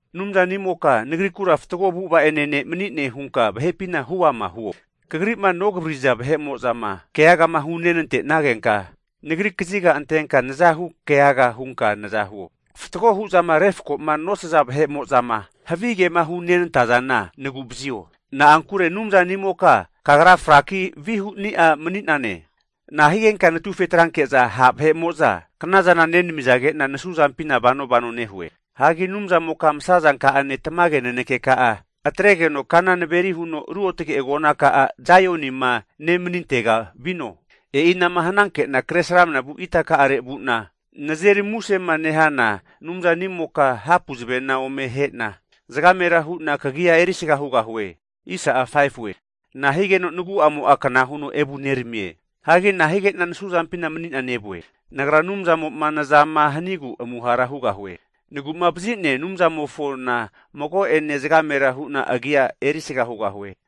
Anumzanimoka nagrikura fatgo avu'ava'ane ne' mani'ne hunka vahepina huama huo. Kagri'ma nogavariri'za vahe'mo'zama keagama hunenantenagenka nagri kazika antenka nazahu keaga hunka naza huo. Fatgo huzama refkoma nosaza vahe'mo'zama havigema hunentazana nagu'vazio. Na'ankure Anumzanimoka Kagra fraki vihuni'a mani'nane. Nahigenka natufetranke'za, ha' vahe'mo'za knazana nenamizage'na nasuzampina vanovano nehue? Hagi Anumzamoka masazanka'ane tamage nanekeka'a atregeno kana naveri huno navareno ruotge agonaka'a, Saionima nemanintega vino. E'ina'ma hnanke'na kre sramanavu itaka'are vu'na nazeri musema nehana Anumzanimoka hapu zavena ome ahe'na zagamera hu'na kagia erisga hugahue. Nahigeno nagu'amo'a kna huno evuneramie? Hagi nahige'na nasuzampina mani'na nevue? Nagra Anumzamo'ma nazama hanigu amuhara hugahue! Nagu'mavazi'nea Anumzanimofona mago'ene zagamera hu'na agia erisga hugahue.